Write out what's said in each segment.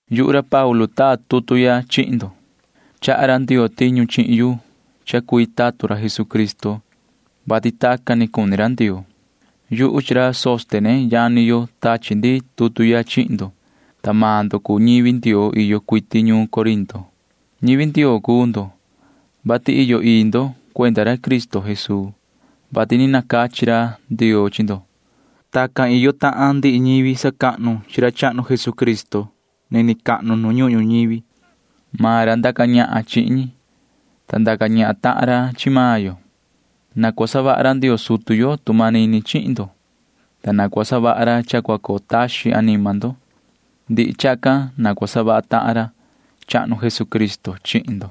Yuhu ra Paulu taa tutu ya chihin ndo. Chaha ra Ndioo tiñu chihin yu cha cui tatun ra Jesucristo, vati tacan ni cuni ra Ndioo. Yuhu chi ra Sóstene yani yo tachi ndi tutu ya chihin ndo, ta maan ndo cuu ñivi Ndioo iyo cuiti ñuun Corinto. Ñivi Ndioo cuu ndo, vati iyo ii ndo cuenda ra Cristo Jesuu, vati ni nacachi ra Ndioo chi ndo. Tacan tahan iyo ndihi ñivi sacahnu chi ra chahnu Jesucristo nini cahnu nu ñuhun ñuñivi. Maan ra ndaca ñahan chihin ñi, ta ndaca ñahan tahan ra chi maan yo. Na cua savaha ra Ndioo sutu yo tu manini chihin ndo, ta na cua savaha ra cha cua coo taxin anima ndo. Ndihi chacan na cua savaha tahan ra chahnu Jesucristo chihin ndo.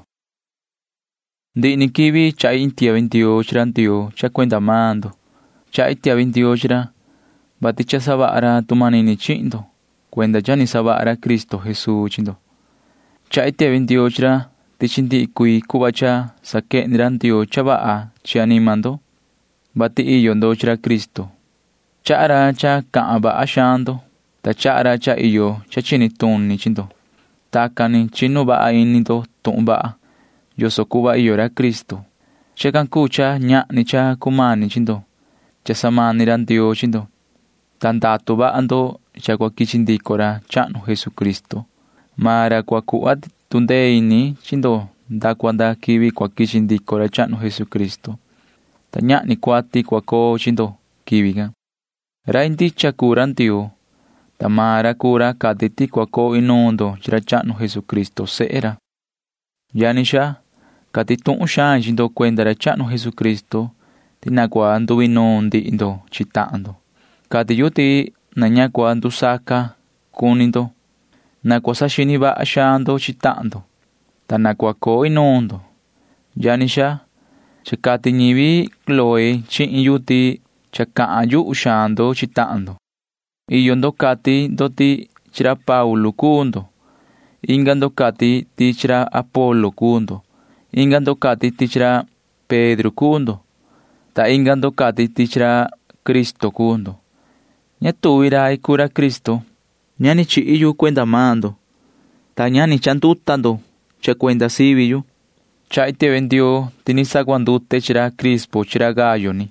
Ndihi ni quivi chahi iin tiahvi ndioo chi ra Ndioo cha cuenda maan ndo. Chahi tiahvi ndioo chi ra, vati cha savaha ra tu manini chihin ndo cuenda cha ni savaha ra Cristo Jesuu chi ndo. Chahi tiahvi ndioo chi ra ti chi ndihi cuii cuhva cha saquehni ra Ndioo cha vaha chi anima ndo, vati iyo ndo chi ra Cristo. Chaha ra cha cahan vaha xaan ndo, ta chaha ra cha iyo cha chini tuni chi ndo. Tacan ni chinu vaha ini ndo tuhun vaha yoso cuhva iyo ra Cristo. Chacan cuu cha ñahni cha cumani chi ndo cha samani ra Ndioo chi ndo, ta ndatu vaha ndo cha cua quichi ndico ra chahnu Jesucristo. Maan ra cua cuhva tu ndee ini chi ndo nda cua nda quivi cua quichi ndico ra chahnu Jesucristo, ta ñahni cuati cua coo chi ndo quivi can. Rai ndicha cuu ra Ndioo, ta maan ra cuu ra cati ti cua coo inuun ndo chi ra chahnu Jesucristo sehe ra. Yani xaa, cati tuhun xain chi ndo cuenda ra chahnu Jesucristo ti na cua nduinuun ndihi ndo chi tahan ndo. Cati yu ti na ña cua ndusaca ca cuni ndo. Na cua saxini vaha xaan ndo chi tahan ndo, ta na cua coo inuun ndo. Yani xaa, cha cati ñivi Cloé chihin yu ti cha cahan yuhu xaan ndo chi tahan ndo. Iyo ndo cati ndo ti chi ra Paulu cuu ndo. Inga ndo cati ndo ti chi ra Apolo cuu ndo. Inga ndo cati ti chi ra Pedro cuu ndo, ta inga ndo cati ti chi ra Cristo cuu ndo. Ña tuvi rai cuu ra Cristo. Ña ni chihi yu cuenda maan ndo, ta ni ña ni chanduta ndo cha cuenda sivi yu. Chahi tiahvi ndioo ti ni sacuandute chi ra Crispo chi ra Gayo ni,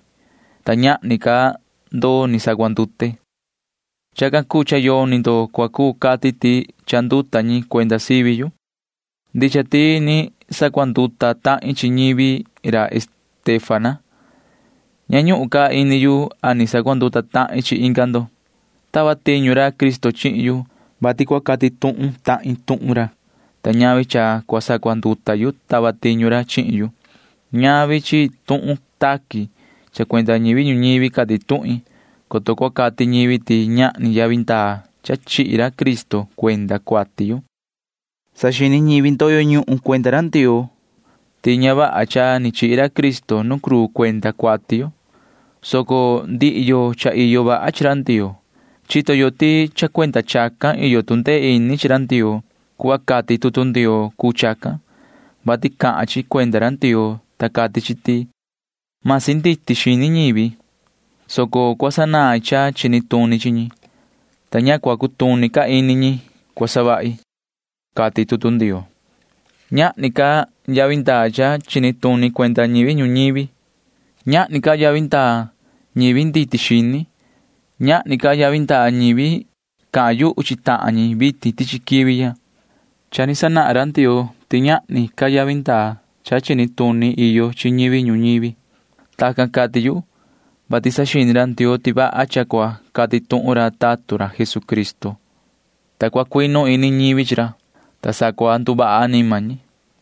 ta ñahni ca ndo ni sacuandute. Chacan cuu cha yoni ndo cua cuu cati ti chanduta ñi cuenda sivi yu. Ndicha ti ni sacuanduta tahin chi ñivi ra Estéfana. Ña ñuhun ca ini yu a ni sacuanduta tahin chi inga ndo. Tava tiñu ra Cristo chihin yu, vati cua cati tuhun tahin tuhun ra, ta ñavi cha cua sacuanduta yu tava tiñu ra chihin yu. Ñavi chi tuhun taqui cha cuenda ñivi ñuñivi cati tuhin, coto cua cati ñivi ti ñahni yavi ndaa cha chihi ra Cristo cuenda cuati yo. Saxini ñivi ndoyo ñuhun cuenda ra Ndioo ti ña vaha cha ni chihi ra Cristo nu cruu cuenda cuati yo, soco ndihi yo cha iyo vaha chi ra Ndioo―chito yo ti cha cuenda chacan iyo tu ndee ini chi ra Ndioo. Cuhva cati tutu Ndioo cuu chacan, vati cahan chi cuenda ra Ndioo, ta cati chi ti: Masi nditi xini ñivi, soco cua sanain cha chini tuni chi ñi, ta ña cua cutuni ca ini ñi cua savahi, cati tutu Ndioo. Ñahni ca yavi ndaa cha chini tuni cuenda ñivi ñuñivi. Ñahni ca yavi ndaa ñivi nditi xini. Ñahni ca yavi ndaa ñivi cahan yuhu chi tahan ñi vitin tichi quivi ya. Cha ni sanahan ra Ndioo ti ñahni ca yavi ndaa cha chini tuni iyo chi ñivi ñuñivi. Tacan cati yu, vati saxini ra Ndioo ti vaha cha cua cati tuhun ra tatun ra Jesucristo, ta cua cuinu ini ñivi chi ra, ta sa cua nduvaha anima ñi.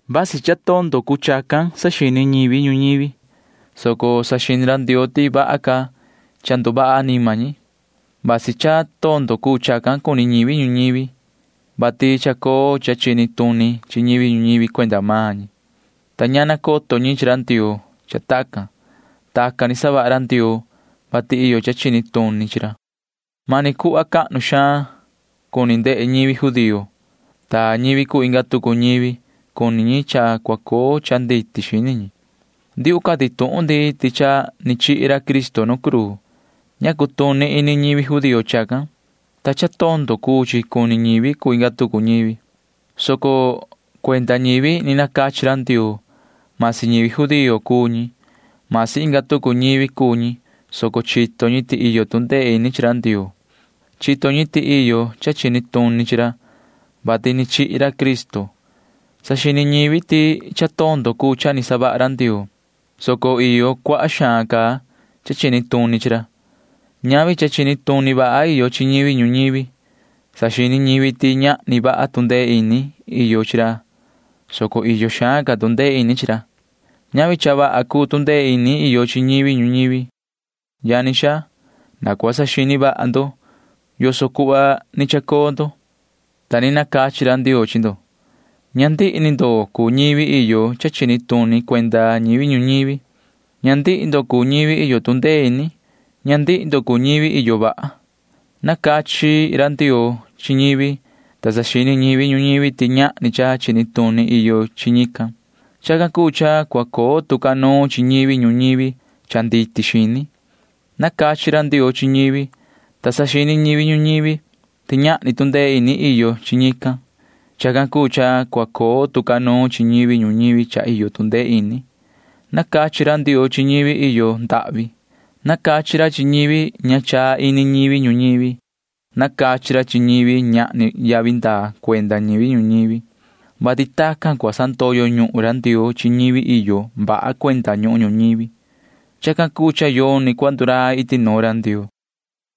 Vasi cha tondo cuu chacan saxini ñivi ñuñivi, soco saxini ra Ndioo ti vaha ca cha nduvaha anima ñi. Vasi cha tondo cuu chacan cuni ñivi ñuñivi, vati chacoo cha chini tuni chi ñivi ñuñivi cuenda maan ñi, ta ña nacoto ñi chi ra Ndioo cha tacan. Tacan ni savaha ra Ndioo, vati iyo cha chini tuni chi ra. Mani cuhva cahnu xaan cuni ndehe ñivi judío, ta ñivi cuu inga tucu ñivi―cuni ñi cha cua coo cha nditi xini ñi. Ndiuhu cati tuhun ndi ti cha ni chihi ra Cristo nu cruu. Ña cutuni ini ñivi judío chacan, ta cha tondo cuu chi cuni ñivi cuu inga tucu ñivi, soco cuenda ñivi ni nacachi ra Ndioo―masi ñivi judío cuu ñi, masi inga tucu ñivi cuu ñi, soco chito ñi ti iyo tu ndee ini chi ra Ndioo. Chito ñi ti iyo cha chini tuni chi ra, vati cha ni chihi ra Cristo. Saxini ñivi ti cha tondo cuu cha ni savaha ra Ndioo, soco iyo cuaha xaan ca cha chini tuni chi ra. [Ñavi cha chini tuni vaha iyo chi ñivi ñuñivi.] Saxini ñivi ti ñahni vaha tu ndee ini iyo chi ra, soco iyo xaan ca tu ndee ini chi ra. [Ñavi cha vaha cuu tu ndee ini iyo chi ñivi ñuñivi.] Yani xaa, na cua saxini vaha ndo yoso cuhva ni chacoo ndo, ta ni nacachi ra Ndioo chi ndo. Ña ndihi ni ndo cuu ñivi iyo cha chini tuni cuenda ñivi ñuñivi. Ña ndihi ndo cuu ñivi iyo tu ndee ini. Ña ndihi ndo cuu ñivi iyo vaha. Nacachi ra Ndioo chi ñivi, ta saxini ñivi ñuñivi ti ñahni cha chini tuni iyo chi ñican. Chacan cuu cha cua coo tu ca nuun chi ñivi ñuñivi cha nditi xini. Nacachi ra Ndioo chi ñivi, ta saxini ñivi ñuñivi ti ñahni tu ndee ini iyo chi ñican. Chacan cuu cha cua coo tu ca nuun chi ñivi ñuñivi cha iyo tu ndee ini. Nacachi ra Ndioo chi ñivi iyo ndahvi. Nacachi ra chi ñivi ña chaa ini ñivi ñuñivi. Nacachi ra chi ñivi ñahni yavi ndaa cuenda ñivi ñuñivi, vati tacan cua sandoyo ñuhun ra Ndioo chi ñivi iyo vaha cuenda ñuhun ñuñivi. Chacan cuu cha yoni cua ndurai iti nuun ra Ndioo.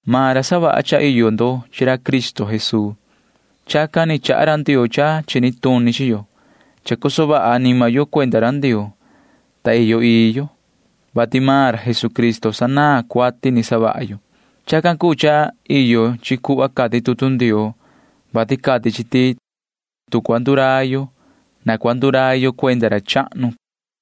Maan ra savaha cha iyo ndo chi ra Cristo Jesuu. Chacan ni chaha ra Ndioo cha chini tuni chi yo. Chacoso vaha anima yo cuenda ra Ndioo, ta iyo ii yo, vati maan ra Jesucristo sanaan cuati ni savaha yo. Chacan cuu cha iyo chi cuhva cati tutu Ndioo, vati cati chi ti tu cua ndurai yo, na cua ndurai yo cuenda ra chahnu, cati chi.